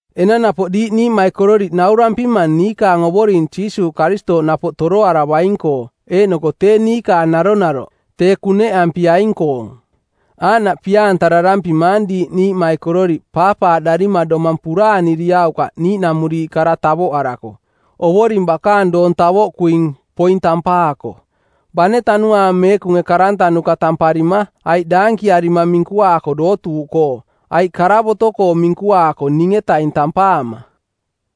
Enang napoꞌ diiꞌ niiꞌmaikororiꞌ naurampimang niikaang Ovoring Jiisuuꞌ Karistooꞌ napoꞌ toroaravaing-koo eeꞌnoko tee niikaang naronaroꞌ tee, kuneꞌampiaing-koong. Aaꞌnaꞌ pia-antararampimaang diiꞌ niiꞌmaikororiꞌ paapaaꞌdarima domang puraaniriaukaꞌ niiꞌnamuriiꞌ kara tavoꞌarako, Ovoring bakaang doong tavoꞌkuing, poing, tampaako, bane Tanuaang Meekunge karantanuka˜ tamparima aiꞌ daankiarima minkuaako dootuuꞌkoo aiꞌ karavoto-koo˜ minkuaako ning-etaing tampaama.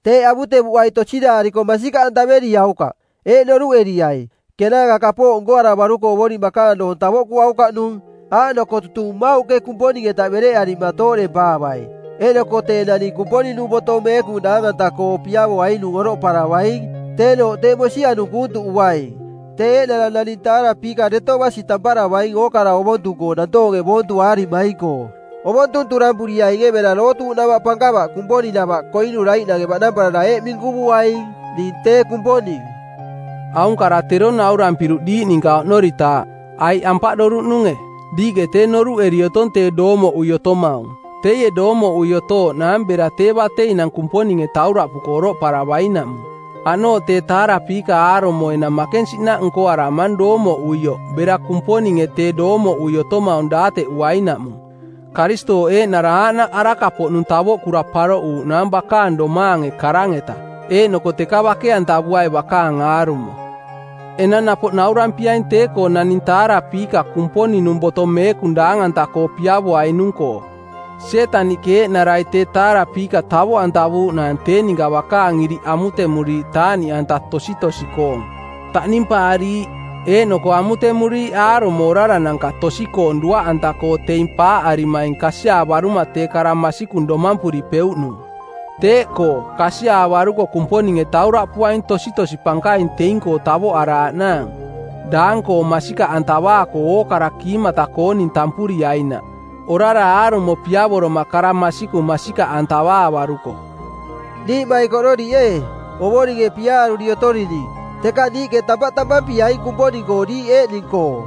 Teeꞌ avutevuꞌai tosiraariko masikaꞌantavereriaukaꞌ. Eeꞌ noruꞌeriai, kenaanka kapooꞌ nkoaravaruko Ovoring bakaang doong tavoꞌkuaukaꞌnung, aaꞌnoko tutung mmauꞌke Kumponing-eta bereꞌarima tooꞌdempaavai eeꞌnoko tee naning Kumponing-nung Boto Meekung daang-anta-koo piavoainung oroꞌparavaing, teenooꞌ tee mosianung kuuntuꞌuaing. Tee eeꞌnara naning taarapiika deto basi tamparavaing ookara ovontung-koo nantoonge boontuaarimaing-koo. Ovontung turampuriainge bera dootuuꞌnava pankava Kumponing-nava koinuraiꞌnange baꞌnamparara eeꞌ minkuvuaing: “Ning tee Kumponing.” Aung kara tero naurampiruꞌ diiꞌ ninka oꞌnoritaaꞌ, aiꞌ ampaꞌdoruꞌnunge? Diiꞌke tee noruꞌeri otong tee doomoꞌui otomaung. Teie doomoꞌui otooꞌnaang bera tee bateinang Kumponinge tauraꞌpuko oroꞌparavainaꞌmung. Aꞌnooꞌ tee taarapiika aarumo enang makensiꞌnaꞌ nko-nkoaramang doomoꞌuioꞌ bera Kumponinge tee doomoꞌui otomaung daateꞌuainaꞌmung. Karistooꞌ eeꞌnara aaꞌnaꞌ araka-poꞌnung tavoꞌkura paroꞌuuꞌnaang bakaang domaange karang-eta, eeꞌnoko teka bake-antavuai bakaang aarumo. Enang napoꞌ naurampiaing tee-koo naning taarapiika Kumponing-nung Boto Meekung daang-anta-koo piavoainung-koo; Sietaniꞌke eeꞌnarai tee taarapiika tavoꞌantavuuꞌnaang tee ninka bakaang iriꞌ amutemuriiꞌ taaꞌniꞌanta tositosi-koong, taꞌnimpaariiꞌ, eeꞌnoko amutemuriiꞌ aarumo orarananka tosi-koong duaꞌanta-koo teing paaꞌarimaing kasiaavaruma tee kara masikung domampuripeuꞌnung. Teeꞌkoo, kasiaavaruko Kumponinge tauraꞌpuaing tositosi pankaing teing-koo tavoꞌaraaꞌnaang, daang-koong masikaꞌantavaako ookara kiimata-kooning tampuriainaꞌ, orara aarumo piavoroma kara masikung masikaꞌantavaavaruko. Niiꞌmaikororiꞌ ee, Ovoringe piaaruri otorining, teka niiꞌke tampaꞌ tampampiaing Kumponing-koo diiꞌ eeꞌning-koo.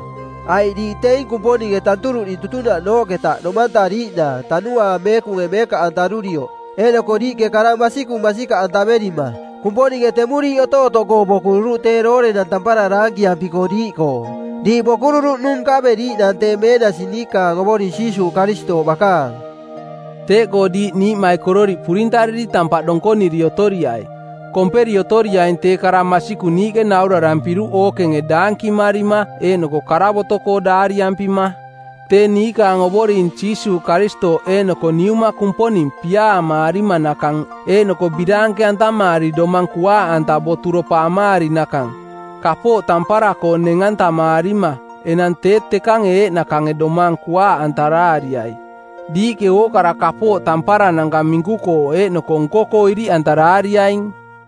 Aiꞌ diiꞌ teing Kumponinge tanturuꞌning tutunaꞌnooꞌketa domantariiꞌnaang Tanuaang Meekunge meekaꞌantarurioꞌ eeꞌnoko diiꞌke kara masikung masikaꞌ antaverima. Kumponinge temuriiꞌ otootoꞌkoo bokururuꞌ tee doorenang tampara daankiampiko diiꞌkoo. Diiꞌ bokururuꞌnung nkaveriiꞌnaang tee meenasi niikaang Ovoring Jiisuuꞌ Karistooꞌ bakaang. Teeꞌkoo diiꞌ niiꞌmaikororiꞌ purintariri tampaꞌ donkoniri otoriai, komperi otoriaing tee kara masikung niiꞌke naurarampiruꞌ ookenge daankimarima eeꞌnoko karavoto-koo daariampima. Tee niikaang Ovoring Jiisuuꞌ Karistooꞌ eeꞌnoko Niuma Kumponing piaamaarimanakang eeꞌnoko biraanke-antamaari domang kuaaꞌanta boturopa amaarinakang, kapooꞌ tampara-koo neng-antamaarima – enang tee tekange eeꞌnakange domang kuaaꞌantaraariai. Diiꞌke ookara kapooꞌ tamparananka minku-koo eeꞌnoko nko-koo iriꞌantaraariaing.